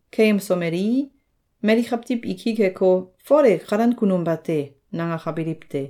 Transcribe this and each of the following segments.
Keyemsomelii, mali kawtiw i ki keko, “Fol e kalan kunum bate!”, nangakabiliw te.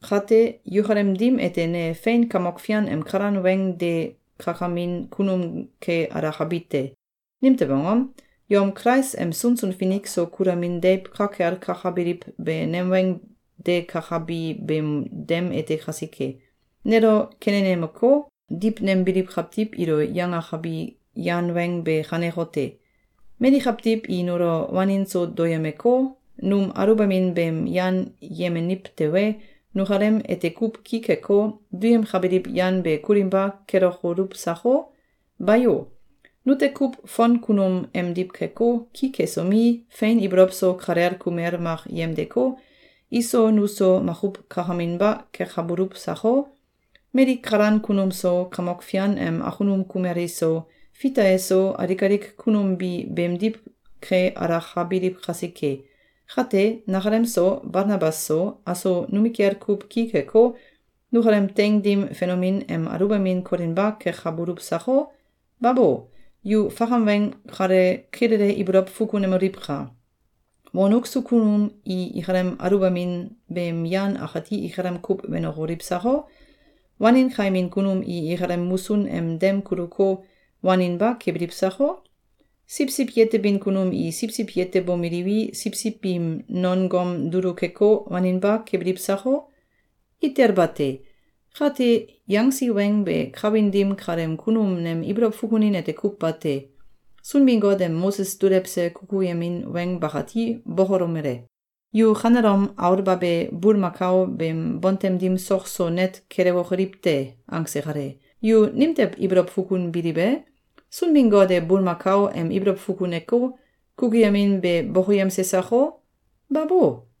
Kate, yukalem dim ete ne fein Kamok Fian em kalan weng de kakamin kunum ke alakabi te. Nimtew angom? Yom Kulais em sunsun finik so kulamin deiw ka kel kakabiliw be nem weng de kakabi beem dem ete kasike. Nelo kenenemeko, diwnembiliw kawtiw ilo yangakabi yan weng be kanekote: Mali kawtiw i nulo wanin so dokoyemeko, num aluwbamin beem yan yemeniw tewe, nukalem ete kuw ki keko, duyemkabiliw yan be kulinba kelokoluw sako? Bayo! Nute kuw fon kunum emdiw keko, ki kesomi, fein ibolow so kalel kumel mak yemdeko, iso nuso makuw kakaminba kekabuluw sako? Mali kalan kunum so, Kamok Fian em akunum kumel iso, Fita eso, alik alik kunum bi beemdiw ke alakabiliw kasike. Kate, nakalem so, Balnabas so, aso numikel kuw ki keko, nukalem teing dim fenomin em aluwbamin kolinba kekabuluw sako? Babo! Yu fakam weng kale kilele ibolow fukunemoliwka! Wonuk so kunum i ikalem aluwbamin beem yan akati ikalem kuw wenokoliw sako? Wanin kaimin kunum i ikalem musun em dem kuluko, waninba kebiliw sako? Siwsiw yetebin kunum i siwsiw yetebomeliwi, siwsiw biim non gom dulu keko, waninba kebiliw sako? Itel bate! Kate, yangsi weng be kawin dim kaleem kunum nem ibolow fukunin ete kuw bate. Sunbin-Got em Moses dulewse kukuyemin weng bakati bokolomele: “Yu kanelom aulbabe bulmakao beem bontem dim sok so net kelewokoliw te!”, angse kale. Yu nimtew ibolow fukunbiliw e? Sunbin-Got e bulmakao em ibolow fukuneko, kukuyemin be bokoyemse sako? Babo!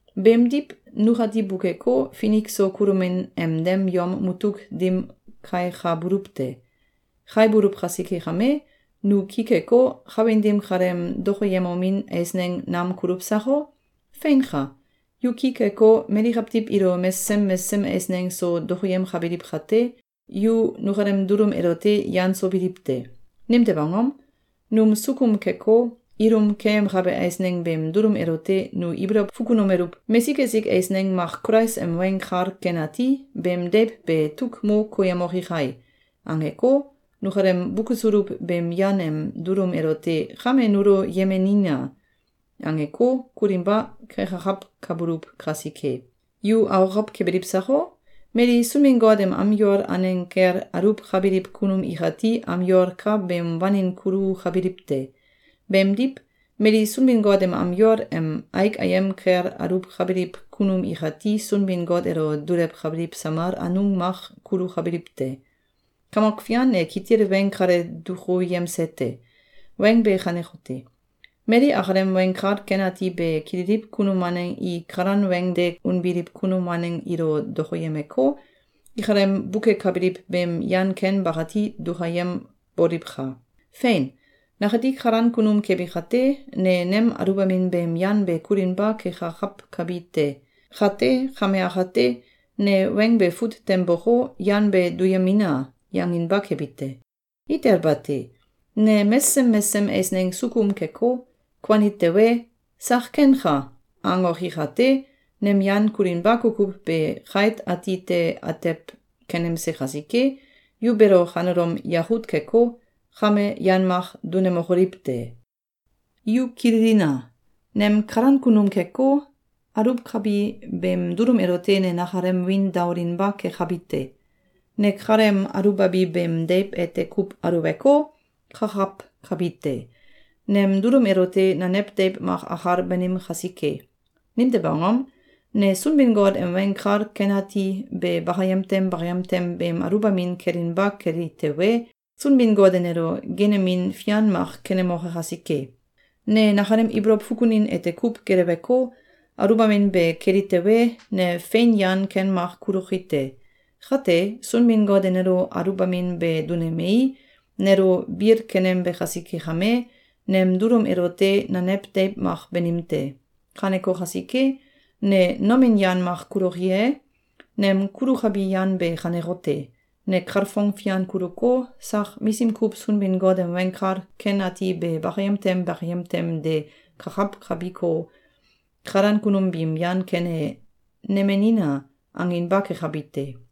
Beemdiw nukati bukeko, finik so kulomin em dem yom mutuk dim kaikabuluw te. Kaibuluw kasike kame, nu ki keko, kawin dim kaleem dokoyemomin eisneng nam kuluw sako? Feinka! Yu ki keko, mali kawtiw ilo mesesem mesesem eisneng so dokoyemkabiliw kate, yu nukalem dulum elote yan so biliw te! Nimtew angom? Num sukum keko, ilum keyemkabe eisneng beem dulum elote nu ibolow fukunomeluw: “Mesik esik eisneng mak Kulais em Weng Kal Ken Ati beem deiw be tuk mo koyemoke kai!”, angeko, nukalem bukesuluw beem yan em dulum elote “Kame nulo yemenina!”, angeko, kulinba kekakawkabuluw kasike. Yu akokow kebiliw sako? Mali Sunbin-Got em am yol aneng kel aluwkabiliw kunum ikati am yol ka beem wanin kulukabiliw te. Beemdiw, mali Sunbin-Got em am yol em aik ayem kel aluwkabiliw kunum ikati Sunbin-Got elo dulewkabiliw samal anung mak kulukabiliw te. Kamok Fian e kitil weng kale dukuyemse te. Weng be kanekote: Mali akalem Weng Kal Ken Ati be kililiw kunum waneng i kalan weng de unbiliw kunum waneng ilo dokoyemeko, ikalem bukekabiliw beem yan ken bakati dukayemboliwka! Fein! Nakati kalan kunum kebi kate, ne nem aluwbamin beem yan be kulinba kekakawkabi te. Kate, kame akate, ne weng be fut tem boko, “Yan be duyemina!”, yanginba kebi te. Itel bate! Ne mesesem mesesem eisneng sukum keko, kuani tewe, “Sak kenka!”, angoki kate, nem yan kulinba kukuw be kait ati te atew kenemse kasike, yu beelo kanelom yakut keko, kame yan mak dunemokoliw te! Yu kililina! Nem kalan kunum keko, aluwkabi beem dulum elote ne nakalem wiin daolinba kekabi te. Ne kaleem aluwbabi beem deiw ete kuw aluweko, kakawkabi te. Nem dulum elote nanew deiw mak akal banim kasike. Nimtew angom? Ne Sunbin-Got em Weng Kal Kan Ati be bakayem tem bakayem tem beem aluwbamin kelinba keli tewe, Sunbin-Got e nelo geenemin fian mak kenemoke kasike. Ne nakalem ibolow fukunin ete kuw geleweko, aluwbamin be keli tewe, ne fein yan ken mak kuloki te. Kate, Sunbin-Got e nelo aluwbamin be dunemei, nelo bil kenembe kasike kame, nem dulum elote nanew deiw mak banim te. Kaneko kasike, ne nomin yan mak kuloki e? Nem kulukabi yan be kanekote: Ne kalfong fian kuluko, sak misim kuw Sunbin-Got em Weng Kal Ken Ati be bakayem tem bakayem tem de kakawkabiko, kalan kunum biim yan ken e “Nemenina!”, anginba kekabi te.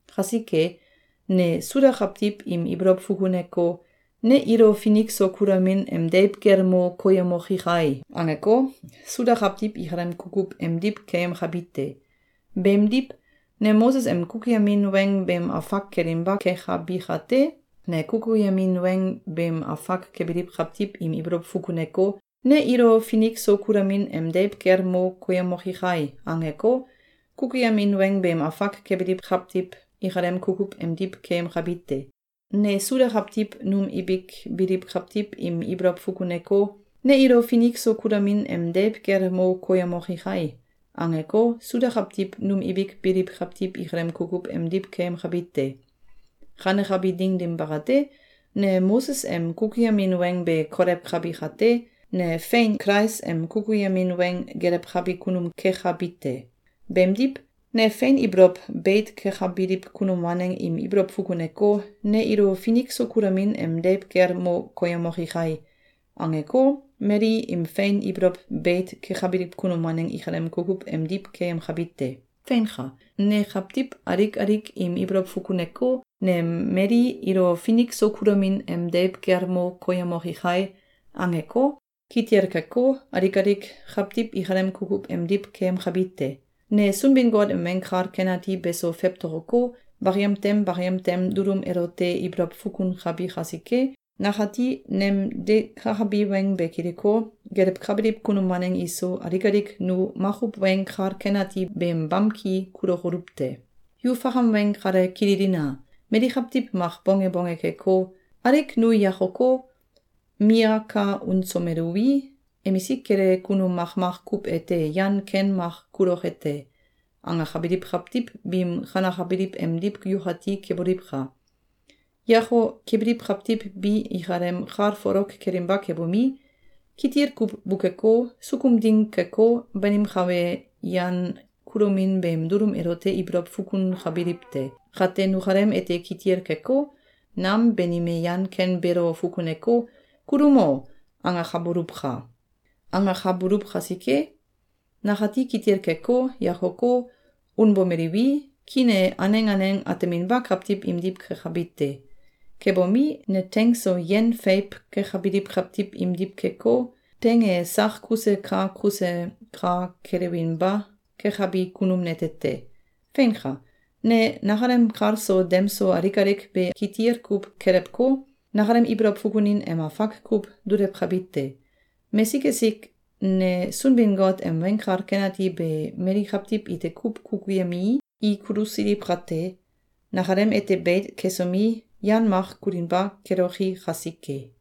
Kasike, ne Suda kawtiw im ibolow fukuneko, “Ne ilo finik so kulamin em deiw kel mo koyemoki kai!”, angeko, Suda kawtiw ikalem kukuw emdiw keyemkabi te. Beemdiw, ne Moses em kukuyemin weng beem afak kelinba kekabi kate, ne kukuyemin weng beem afak kebiliw kawtiw im ibolow fukuneko, “Ne ilo finik so kulamin em deiw kel mo koyemoki kai!”, angeko, kukuyemin weng beem afak kebiliw kawtiw ikalem kukuw emdiw keyemkabi te. Ne Suda kawtiw num ibik biliw kawtiw im ibolow fukuneko, “Ne ilo finik so kulamin em deiw kel mo koyemoki kai!”, angeko, Suda kawtiw num ibik biliw kawtiw ikalem kukuw emdiw keyemkabi te. Kanekabi ding dim bakate, ne Moses em kukuyemin weng be kolewkabi kate, ne fein Kulais em kukuyemin weng gelewkabi kunum kekabi te. Beemdiw, ne fein ibolow beit kekabiliw kunum waneng im ibolow fukuneko, “Ne ilo finik so kulamin em deiw kel mo koyemoki kai!”, angeko, mali im fein ibolow beit kekabiliw kunum waneng ikalem kukuw emdiw keyemkabi te. Feinka! Ne kawtiw alik alik im ibolow fukuneko, “Ne mali ilo finik so kulamin em deiw kel mo koyemoki kai!”, angeko, kitil keko, alik alik kawtiw ikalem kukuw emdiw keyemkabi te. Ne Sunbin-Got em Weng Kal Ken Ati beso fewtokoko, bakayem tem bakayem tem beem dulum elote ibolow fukunkabi kasike, nakati nem de kakabi weng be kiliko, gelewkabiliw kunum waneng iso, alik alik nu makuw Weng Kal Ken Ati beem bamki kulokoluw te. Yu fakam weng kale kililina! Mali kawtiw mak bonge bonge keko, “Alik nu yakoko, miyaka unsomeluwi, emisik kele kunum makmak kuw ete yan ken mak kuloke te!”, angakabiliw kawtiw biim kanakabiliw emdiw yukati keboliwka! Yako kebiliw kawtiw bi, ikalem kal folok kelinba kebomi, kitil kuw bukeko, sukum ding keko, banimkabe yan kulomin beem dulum elote ibolow fukunkabiliw te. Kate nukalem ete kitil keko, nam banime yan ken beelo fukuneko, “Kulumo!”, angaboluwka! Angakabuluw kasike, nakati kitil keko, yakoko, unbomeliwi, kiin e aneng aneng ateminba kawtiw imdiw kekabi te. Kebomi, ne teing so yen feiw kekabiliw kawtiw imdiw keko, teing e sak kuse ka kuse ka kelewbinba kebabi kunum nete te. Feinka! Ne nakalem kal so dem so alik alik be kitil kuw kelewko, nakalem ibolow fukunin em afak kuw dulewkabi te. Mesik esik ne Sunbin-Got em Weng Kal Ken Ati be mali kawtiw ite kuw kukuyemii, i kulusiliw kate, nakalem ete beit kesomi, yan mak kulinba keloki kasike.